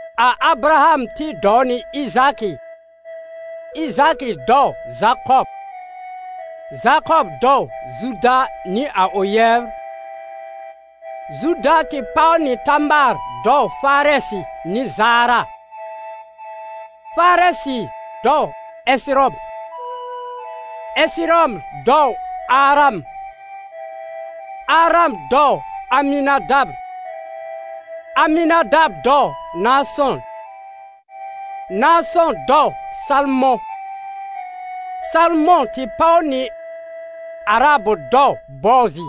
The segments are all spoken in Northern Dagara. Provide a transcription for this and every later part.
A Abraham tɩ dɔw nɩ Ɩzaakɩ, Ɩzaakɩ dɔw Zakɔb, Zakɔb dɔw Zuda nɩ a ʋ yɛbr; Zuda tɩ páw nɩ Tamaar dɔw Farɛsɩ nɩ Zaara, Farɛsɩ dɔw Ɛsɩrɔm, Ɛsɩrɔm dɔw Aram; Aram dɔw Amɩnadab, Amɩnadab dɔw Naasɔ̃, Naasɔ̃ dɔw Salmɔ̃; Salmɔ̃ tɩ páw nɩ Arahab dɔw Boozɩ,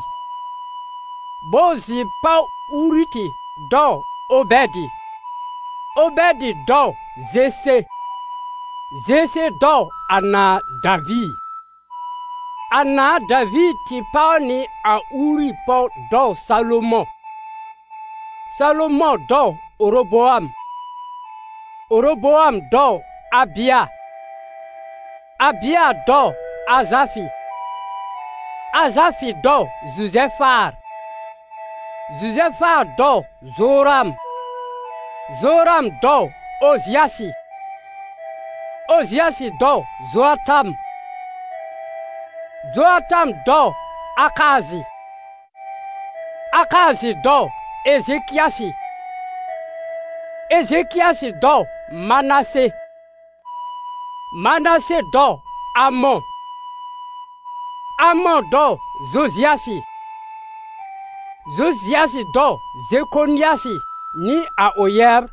Boozɩ páw Urutɩ dɔw Obɛdɩ, Obɛdɩ dɔw Zese; Zese dɔw a nãà Daviir. A nãà Daviir tɩ páw nɩ a Uuri pɔw dɔw Salomɔ̃; Salomɔ̃ dɔw Oroboam, Oroboam dɔw Abɩa, Abɩa dɔw Azafɩ; Azafɩ dɔw Zuzɛfaar, Zuzɛfaar dɔw Zoram, Zoram dɔw Ozɩasɩ; Ozɩasɩ dɔw Zoatam, Zoatam dɔw Akaazɩ, Akaazɩ dɔw Ezekɩasɩ; Ezekɩasɩ dɔw Manase, Manase dɔw Amɔ̃, Amɔ̃ dɔw Zozɩasɩ; Zozɩasɩ dɔw Zekonɩasɩ nɩ a ʋ yɛbr,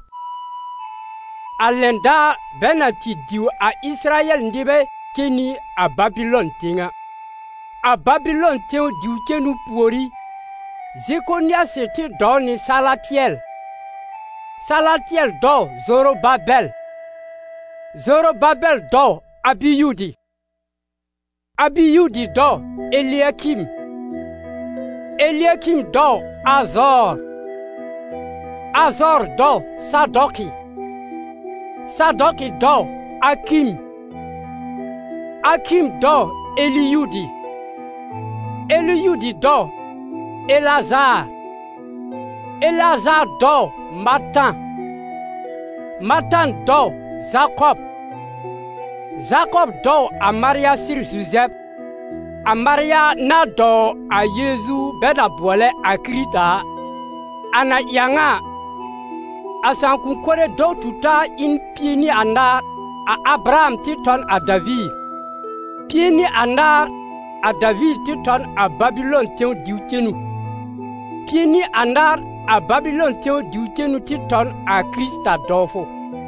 a lɛn daar bɛ na tɩ diw a Ɩsɩrayɛl nɩbɛ cen nɩ a Babɩlɔn tẽw a. A Babɩlɔn tẽw diw-cenu pùorí, Zekonɩasɩ tɩ dɔw nɩ Salatɩɛl, Salatɩɛl dɔw Zorobabɛl, Zorobabɛl dɔw Abiyudɩ, Abiyudɩ dɔw Elɩakɩm, Elɩakɩm dɔw Azɔɔr, Azɔɔr dɔw Sadɔkɩ, Sadɔkɩ dɔw Akɩm, Akɩm dɔw Eliyudɩ; Eliyudɩ dɔw Eleazaar, Eleazaar dɔw Matan, Matan dɔw Zakɔb; Zakɔb dɔw a Marya sɩr Zuzɛb, a Marya na dɔw a Yeezu bɛ na bʋɔlɛ a Kɩrɩta a. A na ɩ a ŋa a, a sãakʋ̃-kore dɔw-tu-taa ɩ n pie nɩ anaar, a Abraham tɩ tɔ n a Daviir, pie nɩ anaar a Daviir tɩ tɔ n a Babɩlɔn tẽw diw-cenu, pie nɩ anaar a Babɩlɔn tẽw diw-cenu tɩ tɔ n a Kɩrɩta dɔwfʋ.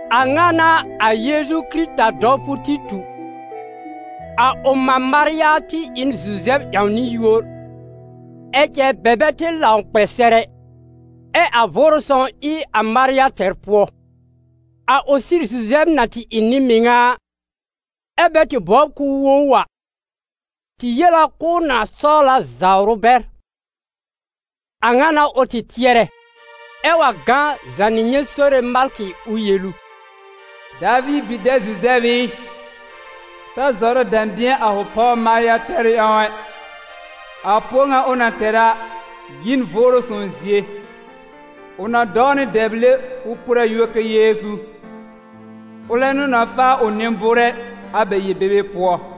A ŋa n'a a Yeezu Kɩrɩta dɔwfʋ tɩ tu. A ʋ mã Marya tɩ ɩ n Zuzɛb ƴãwnɩ-yúor, ɛ cɛ bɛ bɛ tɩ lãw kpɛ sɛr ɛ, ɛ a Vʋʋrʋ Sõw ɩ a Marya tɛr pʋɔ. A ʋ sɩr Zuzɛb na tɩ ɩ nɩ-mɩŋa a, ɛ́ bɛ tɩ bɔbr k'ʋʋ wo ʋ a, tɩ yel a k'ʋʋ na sɔwl a zawr ʋ bɛr. A ŋa n'a ʋ tɩ tɩɛrɛ, ɛ wa gã zànɩ nyɛ̃ Sore malkɩ ʋ yel ʋ: «Daviir bi-dɛb Zuzɛb ɩ, ta zɔrɛ dɛ̃bɩ̃ɛ a fʋ pɔw Marya tɛrʋ ƴãw ɛ, a pʋɔ ŋa ʋ na tɛr a yi n Vʋʋrʋ Sõw zie. Ʋ na dɔw nɩ dɛble fʋ por a yúor kɛ Yeezu, ʋlɛ n'ʋ na faa a ʋ nɩ-bʋʋrɛ a bɛ yel-bebe pʋɔ.»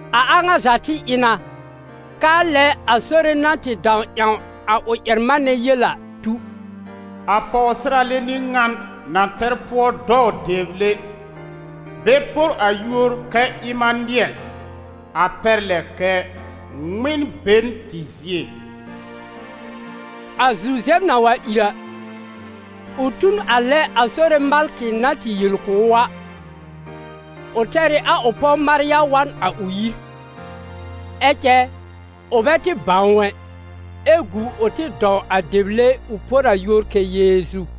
A a ŋa za tɩ ɩ na, k'aa lɛ a Sore na tɩ dãw ƴãw a ʋ ƴɛr-manɛ yel a tu: «A pɔwsɩrale n'ɩ ŋan na tɛr pʋɔ dɔw dɛble bɛ por a yúor kɛ Ɩmanɩɛl, a pɛr lɛ kɛ: ‹Ŋmɩn-be-n-tɩ zie.›» A Zuzɛb na wa ìr a, ʋ tu n a lɛ a Sore malkɩ na tɩ yel kʋ̀ ʋ a, ʋ tɛr ɩ a ʋ pɔw Marya wa n a ʋ yir. Ɛ cɛ ʋ bɛ tɩ bãw ʋ ɛ, ɛ gu ʋ tɩ dɔw a dɛble ʋ por a yúor kɛ Yeezu.